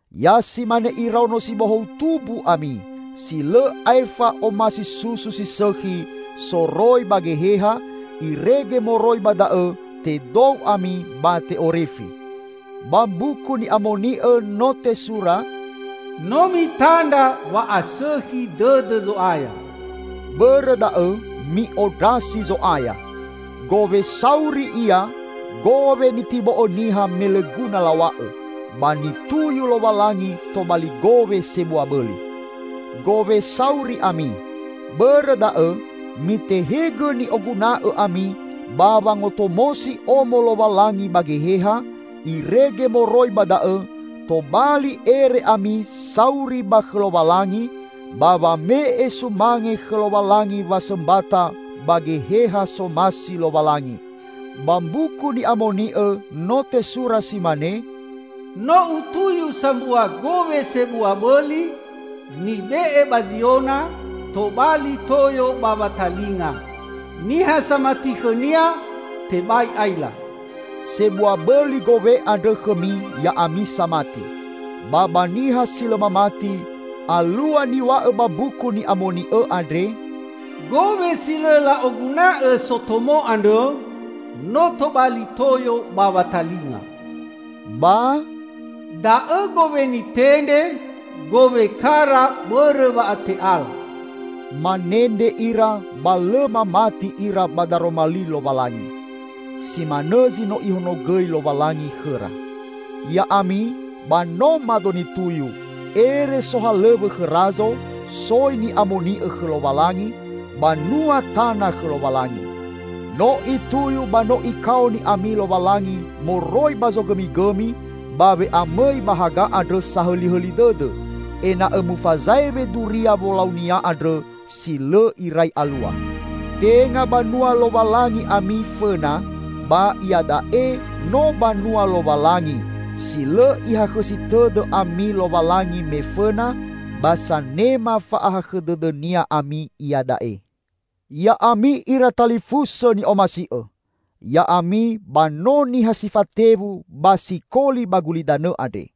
Ya si mane iraono si bohou tumbu ami, si lõ aefa omasi susu si sõkhi soroi ba geheha, irege moroi ba da'õ tedou ami ba te'orifi. Ba Mbuku Ni'amoni'õ no tesura, "No mitandra wa'asõkhi dõdõ Zo'aya." Bõrõ da'õ, mi'ondrasi Zo'aya. Gowe sauri Ia, gowe nitibo'õ niha me lõ guna law̃a'õ, ba nituyu Lowalangi tobali gowe sebua bõli. Gowe sauri ami. Bõrõ da'õ, mitehegõ ni'oguna'õ ami ba wangotomosi Omo Lowalangi ba geheha, irege moroi ba da'õ tobali ere ami sauri ba khõ Lowalangi, ba wame'e sumange khõ Lowalangi wasõmbata ba geheha somasi Lowalangi. Ba Mbuku Ni'amoni'õ no tesura si mane, "No Utuyu sambua gowe sebua bõli, nibe'e ba Ziona, tobali toyo ba watalinga; niha samati khõ-Nia, tebai aila." Sebua bõli gowe andrõ khõmi ya'ami samati. Ba ba niha si lõ mamati, alua niw̃a'õ ba Mbuku Ni'amoni'õ andre, "Gowe si lõ la'oguna'õ sotomo andrõ, no tobali toyo ba watalinga," ba "Da'õ gowe nitendre, gowe kara bõrõ wa'ate'ala." Manendre ira ba lõ mamati ira ba daroma li Lowalangi. Si manõ zi no Ihonogõi Lowalangi khõra. Ya'ami, ba no mado nituyu, ere sohalõw̃õ khõ razo, soi ni'amoni'õ khõ Lowalangi, banua tana khõ Lowalangi. No Ituyu ba no Ikaoni ami Lowalangi moroi ba zogõmigõmi ba we'amõi ba haga andrõ sahõlihõli dõdõ, ena'õ mufazaewe duria wolau-Nia andrõ si lõ irai alua. Tenga banua Lowalangi ami fõna, ba iada'e no banua Lowalangi, si lõ Ihakhõsi tõdõ ami Lowalangi me fõna, ba sanema fa'ahakhõ dõdõ-Nia ami iada'e. Ya'ami ira talifusõ ni'omasi'õ! Ya'ami ba no niha si fatewu ba sikoli ba gulidanõ andre.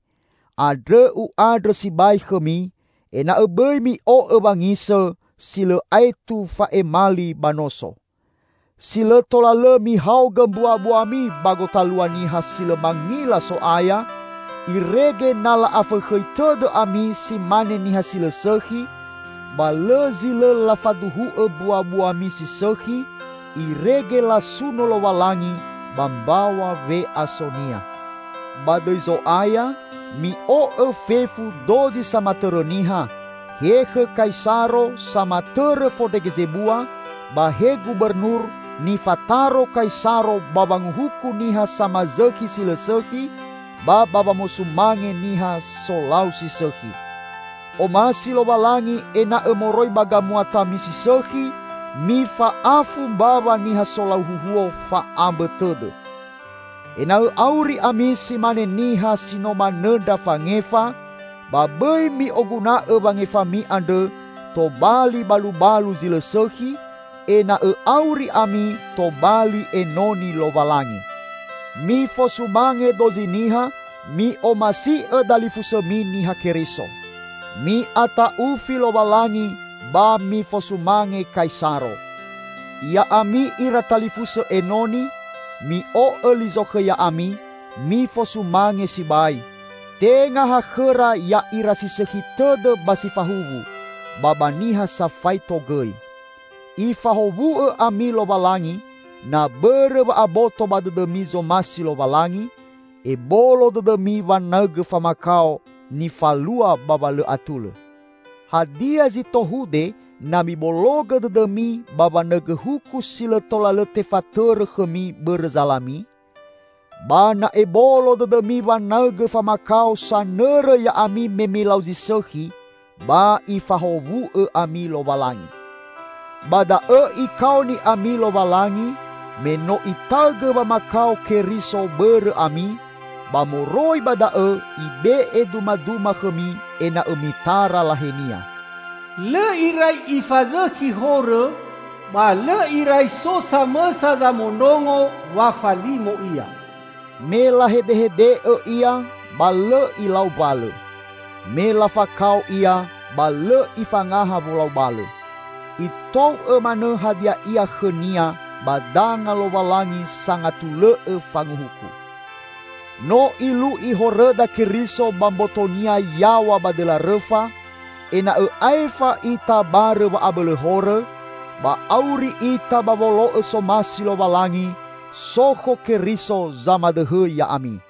Andrõ u'andrõ sibai khõmi, ena'õ bõi mi'o'õ wangisõ, si lõ aetu fa'emali ba noso. Si lõ tola lõ mihaogõ mbuabuami ba gotalua niha si lõ mangila So'aya, irege na la'afõkhõi tõdõ ami si mane niha si lõ sõkhi, ba lõ zi lõ lafaduhu'õ mbuabuami si sõkhi, irege lasuno Lowalangi ba mbaw̃a we'aso-Nia. Ba dõi Zo'aya, mi'o'õ fefu dozi samatõrõ niha: he khõ Kaisaro, samatõrõ fondrege zebua, ba he gubernur, nifataro Kaisaro ba wanguhuku niha samazõkhi si lõ sõkhi, ba ba wamosumange niha solau si sõkhi. Omasi Lowalangi ena'õ moroi ba gamuatami si sõkhi, mifa'afu mbawa niha solau huhuo fa'ambõ tõdõ. Ena'õ auri ami si mane niha si no manõndra fangefa, ba bõi mi'oguna'õ wangefami andrõ tobali balubalu zi lõ sõkhi, ena'õ auri ami tobali enoni Lowalangi. Mifosumange dozi niha, mi'omasi'õ dalifusõmi Niha Keriso. Mi'ata'ufi Lowalangi ba mifosumange Kaisaro. Ya'ami ira talifusõ enoni, mi'o'õ li zokhõ ya'ami, mifosumange sibai, tenga ha khõra ya'ira si sõkhi tõdõ ba si fahuwu, ba ba niha safaito gõi. Ifahowu'õ ami Lowalangi, na bõrõ wa'aboto ba dõdõmi zomasi Lowalangi, ebolo dõdõmi wanaõgõ famakao nifalua ba wa lõ atulõ. Hadia zi tohude na mibologõ dõdõmi ba wanaõgõ huku si lõ tola lõ tefatõrõ khõmi bõrõ zalami? Ba na'ebolo dõdõmi wanaõgõ famakao sanõrõ ya'ami me milau zi sõkhi, ba Ifahowu'õ ami Lowalangi. Ba da'õ Ikaoni ami Lowalangi, me no Itaõgõ wamakao Keriso bõrõ ami, ba moroi ba da'õ Ibe'e dumaduma khõmi ena'õ mitara lahe-Nia. Lõ irai Ifazõkhi horõ, ba lõ irai so samõsa zamondrongo wa falimo Ia. Me lahedehede'õ Ia ba lõ Ilau mbalõ. Me lafakao Ia ba lõ Ifangaha wolau balõ. Itou'õ manõ hadia ia khõ-Nia ba danga Lowalangi sangatulõ'õ fanguhuku. No Ilu'i horõda Keriso ba mboto-Nia yaw̃a ba dõla rõfa, ena'õ aefa ita barõ wa'abõlõ horõ, ba auri ita ba wolo'õ somasi Lowalangi, sokho Keriso zamadõhõ ya'ami.